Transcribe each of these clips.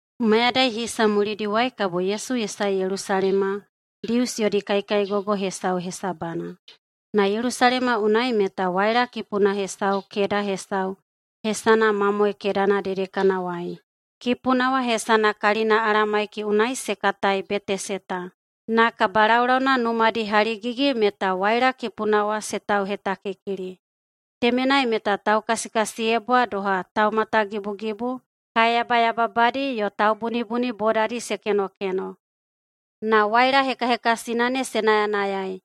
Mayadai hisa mulidiwai kabo Yesu ye sae Yelusalema Dius yodi kaikaigogo hesau hesabana. Na Yelusalema unai meta waila kipuna hesau keda hesau hesana Mamoe Kedana dedekanawai. Kipuna wa hesana kalina Alamaiki unai se katai Beteseta. Na kabalaulauna numadi haligigi meta waila kipuna wa se tauhetakikili. Temenai meta taukasikasiyebwa doha taumatagibugibu, kae yabayababadi yo taubunibuni bodadi se kenokeno [na waila hekahekasina ne se nayanayai.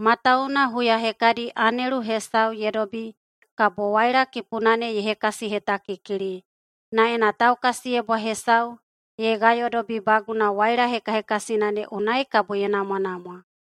Matawuwuna huya hekadi anelu hesau ye dobi kabo waila kipuna ne ye hekasihetakikili, na ena taukasiyebwa hesau ye gayodobibaguna waila hekahekasina ne unai kabo ye namwanamwa.]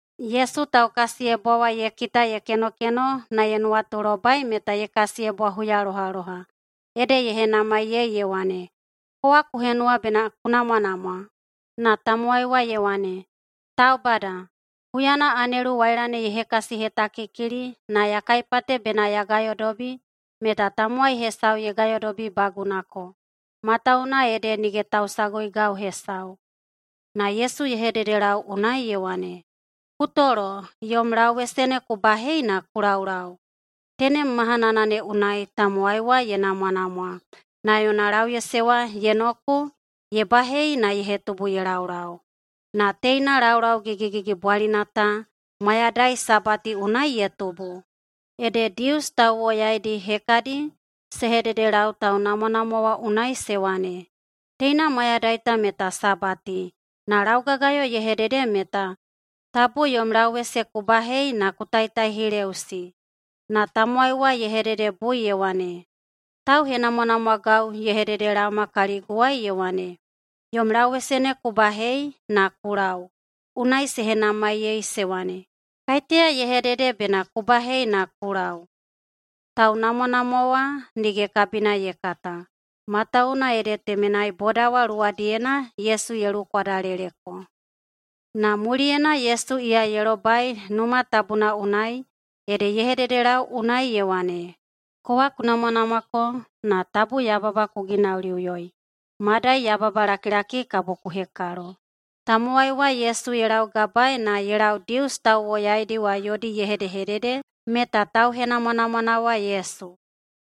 Yesu taukasiyebwa wa ye kita ye kenokeno na ye nuwatulobai meta ye kasiyebwa huyalohaloha, ede ye henamaiyei ye wane, “Kowa ku henuwa bena ku namwanamwa?” Na tamowai wa ye wane, “Taubada, huyana anelu waila ne ye hekasihetakikili na ya kaipate bena ya gayodobi meta tamowai hesau ye gayodobibagunako, matawuwuna ede nige tausaguigau hesau.” Na Yesu ye hededelau unai ye wane, “Ku tolo yom lauwese ne ku bahei na ku laulau.” Tenem mahana ne unai tamowai wa ye namwanamwa, na yona lauwese wa ye noku, ye bahei na ye hetubu ye laulau. Na teina laulau gigigigibwalina ta mayadai Sabati unai ye tubu. Ede Dius tauwoyaidi hekadi se hededelau taunamwanamwa wa unai se wane, “Teina mayadai ta meta Sabati, na laugagayo ye hedede meta tabu yom lauwese ku bahei na ku taitaihileꞌusi.” Na tamowai wa ye hededebui ye wane, “Tauhenamwanamwagau ye hededelaoma kaliguwai ye wane, ‘Yom lauwese ne ku bahei na ku lau.’” Unai se henamaiyei se wane, “Kaiteya ye hedede bena ku bahei na ku lau?” Taunamwanamwa wa nige kabina ye kata, matawuwuna ede temenai boda wa luwadiyena Yesu ye luwukwadaleleko. Na muliyena Yesu iya ye lobai Numa Tabuna unai, ede ye hededelau unai ye wane, “Kowa ku namwanamwako, na tabu yababa ku ginauliꞌuyoi, madai yababalakilaki kabo ku hekalo.” Tamowai wa Yesu ye laugabaei na ye lau Dius tauwoyaidi wa yodi ye hedehedede meta tauhenamwanamwana wa Yesu.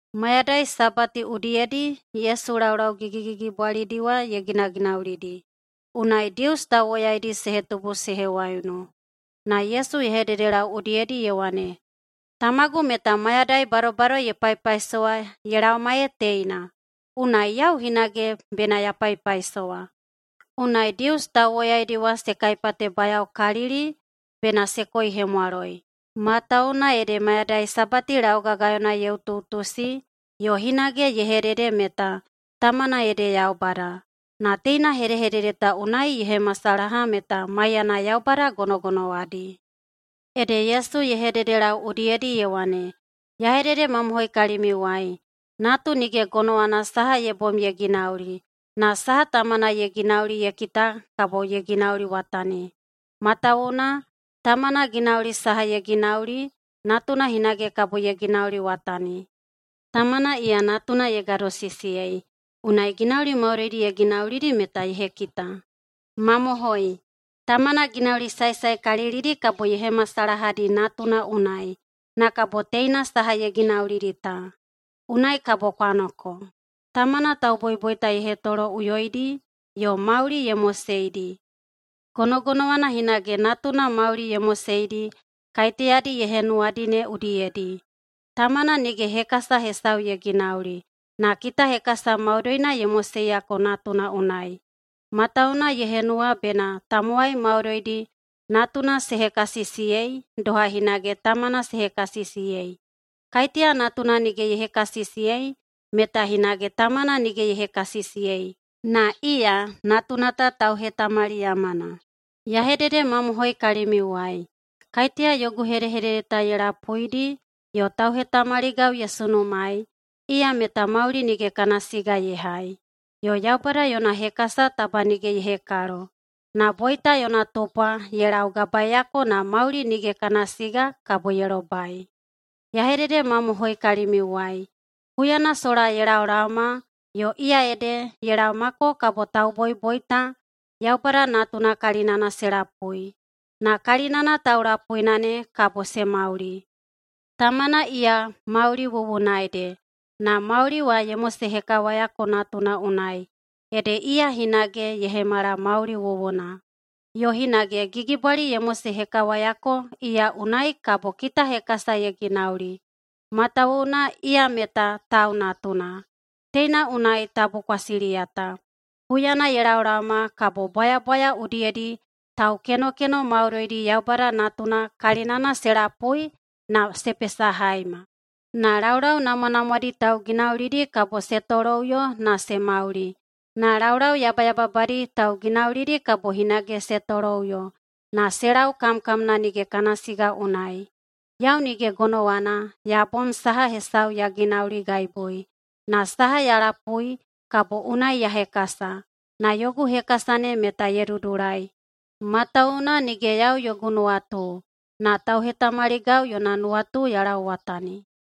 Mayadai Sabati udiyedi Yesu laulau gigigigibwalidi wa ye ginaginaulidi, unai Dius tauwoyaidi se hetubu se hewaiunu. Na Yesu ye hededelau udiyedi ye wane, “Tamagu meta mayadai badobado ye paipaisowa ye laoma ee teina, unai yau hinage bena ya paipaisowa.” Unai Dius tauwoyaidi wa se kaipatebayaokalili bena se koihemwaloi, matawuwuna ede mayadai Sabati laugagayona ye utuꞌutusi, yo hinage ye hedede meta tamana ede Yaubada. Na teina hedehedede ta unai ye hemasalaha meta maiyana Yaubada gonogonowadi. Ede Yesu ye hededelau udiyedi ye wane, “Ya hededemamohoi kalimiuwai: Natu nige gonowana saha ye bom ye ginauli, na saha Tamana ye ginauli ye kita kabo ye ginauliwatani. Matawuwuna Tamana ginauli saha ye ginauli, Natuna hinage kabo ye ginauliwatani. Tamana iya Natuna ye gadosisiyei, unai ginauli maudoidi ye ginaulidi meta ye hekita. Mamohoi, Tamana ginauli saesaekalilidi kabo ye hemasalahadi Natuna unai, na kabo teina saha ye ginaulidi ta. Unai kabo kwa noko. Tamana tauboiboita ye hetoloꞌuyoidi yo mauli ye moseidi, gonogonowana hinage Natuna mauli ye moseidi kaiteyadi ye henuwadi ne udiyedi. Tamana nige hekasa hesau ye ginauli, na kitahekasa maudoina ye moseiyako Natuna unai, matawuwuna ye henuwa bena tamowai maudoidi Natuna se hekasisiyei doha hinage Tamana se hekasisiyei. Kaiteya Natuna nige ye hekasisiyei meta hinage Tamana nige ye hekasisiyei, na iya Natuna ta tauhetamaliyamana. Ya hededemamohoi kalimiuwai: Kaiteya yogu hedehedede ta ye lapuidi yo tauhetamaligau ye sunumaei, iya meta mauli nige kana siga ye hai, yo Yaubada yona hekasa taba nige ye hekalo. Na boita yona tupwa ye laugabaeyako na mauli nige kana siga kabo ye lobai. Ya hededemamohoi kalimiuwai: Huyana sola ye laolaoma yo iya ede ye laomako kabo tauboiboita Yaubada Natuna kalinana se lapui. Na kalinana taulapuina ne kabo se mauli. Tamana iya mauli wuwuna ede, na mauli wa ye mosehekawayako Natuna unai, ede iya hinage ye hemala mauli wuwuna. Yo hinage gigibwali ye mosehekawayako iya unai kabo kitahekasa ye ginauli, matawuwuna iya meta Tau Natuna. Teina unai tabu kwa siliyata. Huyana ye laolaoma kabo bwayabwaya udiyedi taukenokeno maudoidi Yaubada Natuna kalinana se lapui na se pesahaima. Na laulau namwanamwadi tauginaulidi kabo se toloꞌuyo na se mauli. Na laulau yabayababadi tauginaulidi kabo hinage se toloꞌuyo, na se lau kamkamna nige kana siga unai. Yau nige gonowana ya bom saha hesau ya ginauligaibui. Na saha ya lapui, kabo unai ya hekasa. Na yogu hekasa ne meta ye dudulai, matawuwuna nige yau yogu nuwatu, na tauhetamaligau yona nuwatu ya lauwatani.”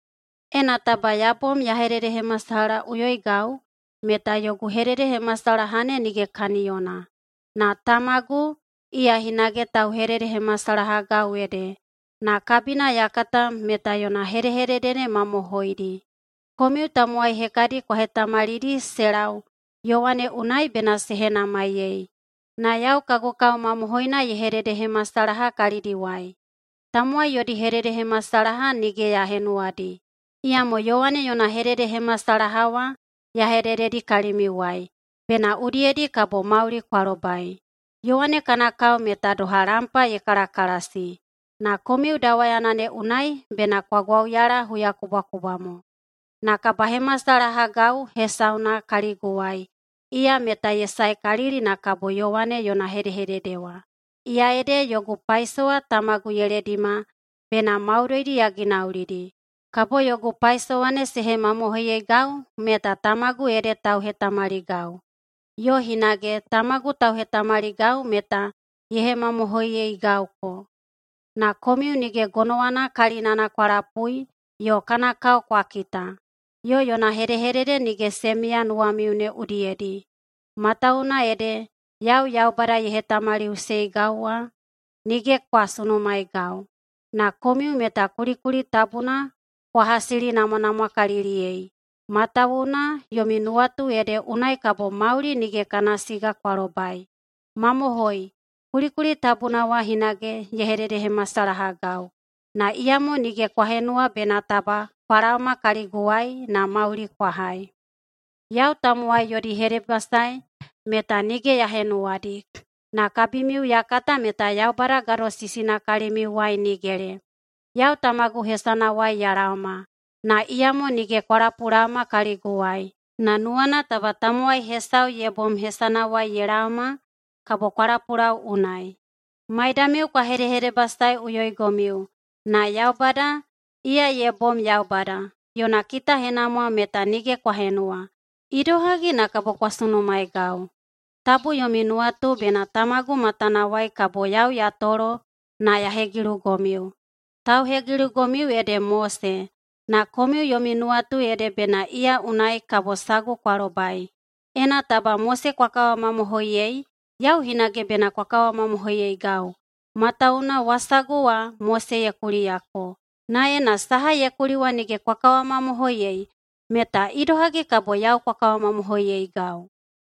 “Ena taba ya bom ya hededehemasalahaꞌuyoigau, meta yogu hededehemasalaha ne nige kaniyona. Na Tamagu, iya hinage tauhededehemasalahagau ede, na kabina ya kata meta yona hedehedede ne mamohoidi. Komiu tamowai hekadi kwa hetamalidi se lau Yowane unai bena se henamaiyei. Na yau kagu kao mamohoina ye hededehemasalaha kalidiwai. Tamowai yodi hededehemasalaha nige ya henuwadi, iyamo Yowane yona hededehemasalaha wa ya hedededi kalimiuwai, bena udiyedi kabo mauli kwa lobai. Yowane kana kao meta doha lampa ye kalakalasi, na komiu dawayana ne unai bena kwa gwauyala huyakubwakubwa mo. Na kabahemasalahagau hesauna kaliguwai, iya meta ye saekalili na kabo Yowane yona hedehedede wa, iya ede yogu paisowa Tamagu ye ledima bena maudoidi ya ginaulidi. Kabo yogu paisowa ne se hemamohoiyeigau meta Tamagu ede tauhetamaligau. Yo hinage Tamagu tauhetamaligau meta ye hemamohoiyeigauko. Na komiu nige gonowana kalinana kwa lapui yo kana kao kwa kita, yo yona hedehedede nige se miya nuwamiu ne udiyedi, matawuwuna ede yau Yaubada ye hetamaliꞌuseigau wa nige kwa sunumaeigau. Na komiu meta kulikuli tabuna kwa hasilinamwanamwakaliliyei, matawuwuna yomi nuwatu ede unai kabo mauli nige kana siga kwa lobai. Mamohoi, kulikuli tabuna wa hinage ye hededehemasalahagau. Na iyamo nige kwa henuwa bena taba kwa laoma kaliguwai na mauli kwa hai. Yau tamowai yodi hedebasae meta nige ya henuwadi. Na kabimiu ya kata meta Yaubada gadosisina kalimiuwai nigele. Yau Tamagu hesanawai ya laoma, na iyamo nige kwa lapulaoma kaliguwai. Na nuwana taba tamowai hesau ye bom hesanawai ye laoma, kabo kwa lapulau unai. Maidamiu kwa hedehedebasaeꞌuyoigomiu, na Yaubada, iya ye bom Yaubada, yona kitahenamwa meta nige kwa henuwa. Idohagi na kabo kwa sunumaeigau? Tabu yomi nuwatu bena Tamagu matanawai kabo yau ya tolo na ya hegilugomiu. Tauhegilugomiu ede Mose, na komiu yomi nuwatu ede bena iya unai kabo sagu kwa lobai. Ena taba Mose kwa kawamamohoiyei, yau hinage bena kwa kawamamohoiyeigau. Matawuwuna wasagu wa Mose ye kuliyako. Na ena saha ye kuli wa nige kwa kawamamohoiyei, meta idohagi kabo yau kwa kawamamohoiyeigau?”